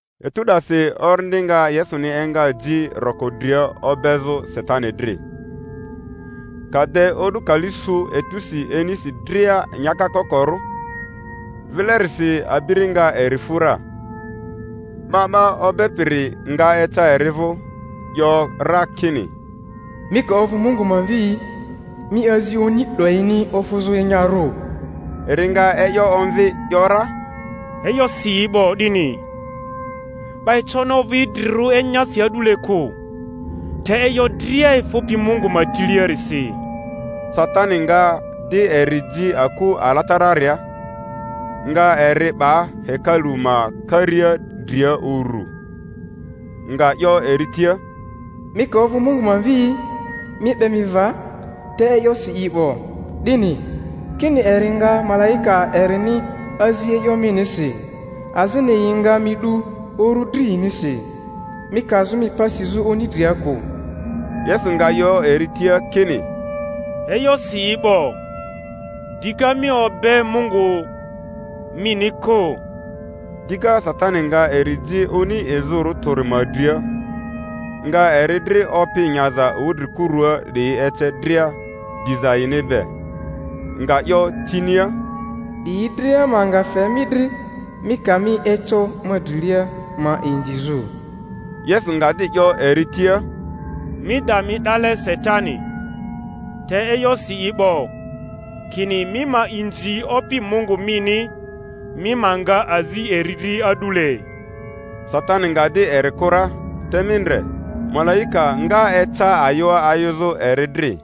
Etu 'dasi Orindi nga Yesuni enga ji roko dria obezᴜ Satani dri. Ka de o'du kali su etusi inisi dria nyaka kokorᴜ, vilerisi abiri nga eri fu ra. 'Ba 'ba obepiri nga eca eri vᴜ, 'yo ra kini, Mi ka ovᴜ Mungu ma Mvi'i, mi azi oni 'doyini ofᴜzᴜ enyarᴜ. Eri nga e'yo omvi 'yo ra, E'yo si i 'bo 'dini, 'Ba econi ovᴜ idrirᴜ enyasi a'dule kᴜ, te e'yo dria efᴜpi Mungu ma tiliarisi. Satani nga di eri ji aku alatararia, nga eri 'ba hekalu ma karia dria uru, nga 'yo eri tia, Mi ka ovᴜ Mungu Mvi'i, mi 'be mi va; te e'yo si i 'bo 'dini, kini, Eri nga malaika erini azi e'yo minisi, azini Yi nga mi 'du uru dri yinisi, mi kazᴜ mi pa sizᴜ oni dria kᴜ. Yesu nga 'yo eri tia kini, E'yo si i 'bo, dika, Mi obe Opi Mungu mini kᴜ. Dika Satani nga eri ji oni izᴜrᴜ tᴜri ma dria, nga eri dri opi nyaza wudrikurua 'diyi ece dria, diza yini be; nga 'yo tinia, 'Diyi dria ma nga fe mi dri, mi ka mi eco ma drilia ma inzizᴜ. Yesu nga di 'yo eri tia, Mi da mi 'dale, Satani! te e'yo si i 'bo, kini, Mi ma inzi Opi Mungu mini, mi ma nga azi eri dri a'dule. Satani nga di eri kᴜ ra; te mi ndre, malaika nga eca ayᴜa ayᴜzᴜ eri dri.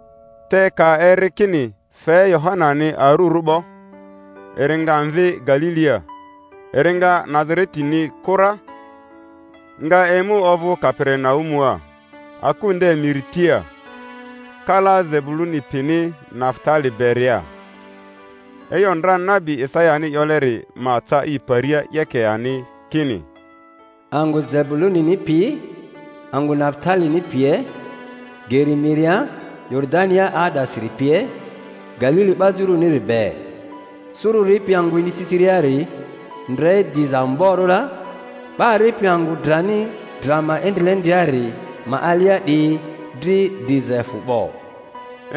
Te ka eri kini fe Yohanani arurᴜ 'bo, eri nga mvi Galilia; eri nga Nazaretini kᴜ ra, nga emu ovᴜ Kaperinaumua, aku nde miri tia, kala Zebuluni pini Nafutali beria; e'yo ndra nabi Isayani 'yoleri ma ca i paria 'yeke ani, kini: Angᴜ Zebulunini pi angᴜ Nafutalini pie, geri miria, Yoridania 'aa'dasiri pie, Galili 'ba juruniri be— suru ripi angᴜ iniciciriari ndre diza amborᴜ ra, 'ba ripi angᴜ drani dra ma endrilendriari ma alia 'diyi dri diza efᴜ 'bo.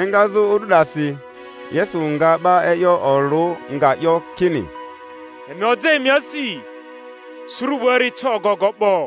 Engazᴜ o'du 'dasi Yesu nga 'ba e'yo olᴜ, nga 'yo kini, Emi oja emi asi; suru 'buari eca ogogo 'bo.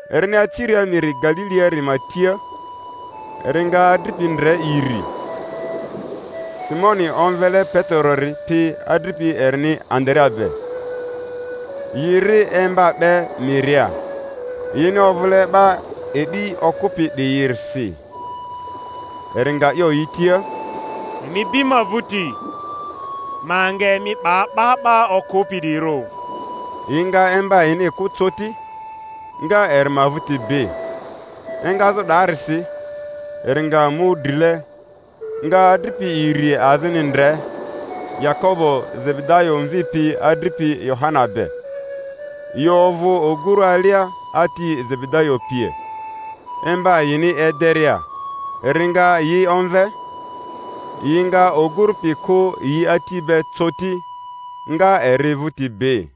Erini aciria miri Galiliari ma tia, eri nga adripi ndre iri, Simoni omvele Peterori pi adripi erini Andarea be, yi ri emba 'be miria; yini ovᴜle 'ba e'bi okᴜpi 'diyirisi. Eri nga 'yo yi tia, Emi bi ma vᴜti, ma nga emi 'ba 'ba 'ba okᴜpi 'diyirᴜ. Yi nga emba yini kᴜ coti, nga eri ma vᴜti bi. Engazᴜ 'daarisi, eri nga mu drile, nga adripi iri azini ndre, Yakobo Zebedayo mvi pi adripi Yohana be, yi ovᴜ oguru alia ati Zebedayo pie, emba yini ederia; eri nga yi omve. Yi nga oguru pi kᴜ yi ati be coti, nga eri vᴜti bi.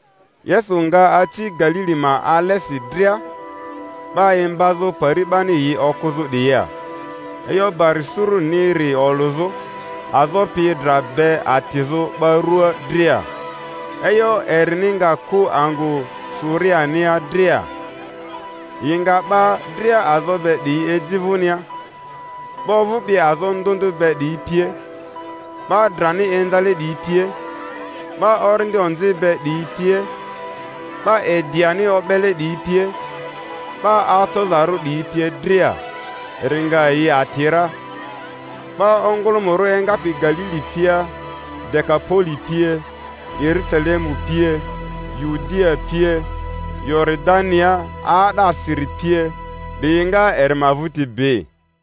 Yesu nga aci Galili ma alesi dria, 'ba imbazᴜ pari 'bani yi okᴜzᴜ 'diyia, e'yo bari suruniri olᴜzᴜ, azo pi dra be atizᴜ 'ba ruaa dria. E'yo erini nga ku angᴜ Suriania dria, yi nga 'ba dria azo be 'diyi eji vᴜnia, 'ba ovᴜpi azo ndᴜ ndᴜ be 'diyi pie, 'ba drani inzale 'diyi pie, 'ba orindi onzi be 'diyi pie, 'ba ediani o'bele 'diyi pie, 'ba acozarᴜ 'diyi pie dria, eri nga yi ati ra. 'Ba ongᴜlᴜmᴜrᴜ engapi Galili pia Dekapoli pie, Yerusalemu pie, Yudia pie, Yoridania 'aa'dasiri pie 'diyi nga eri ma vᴜti bi.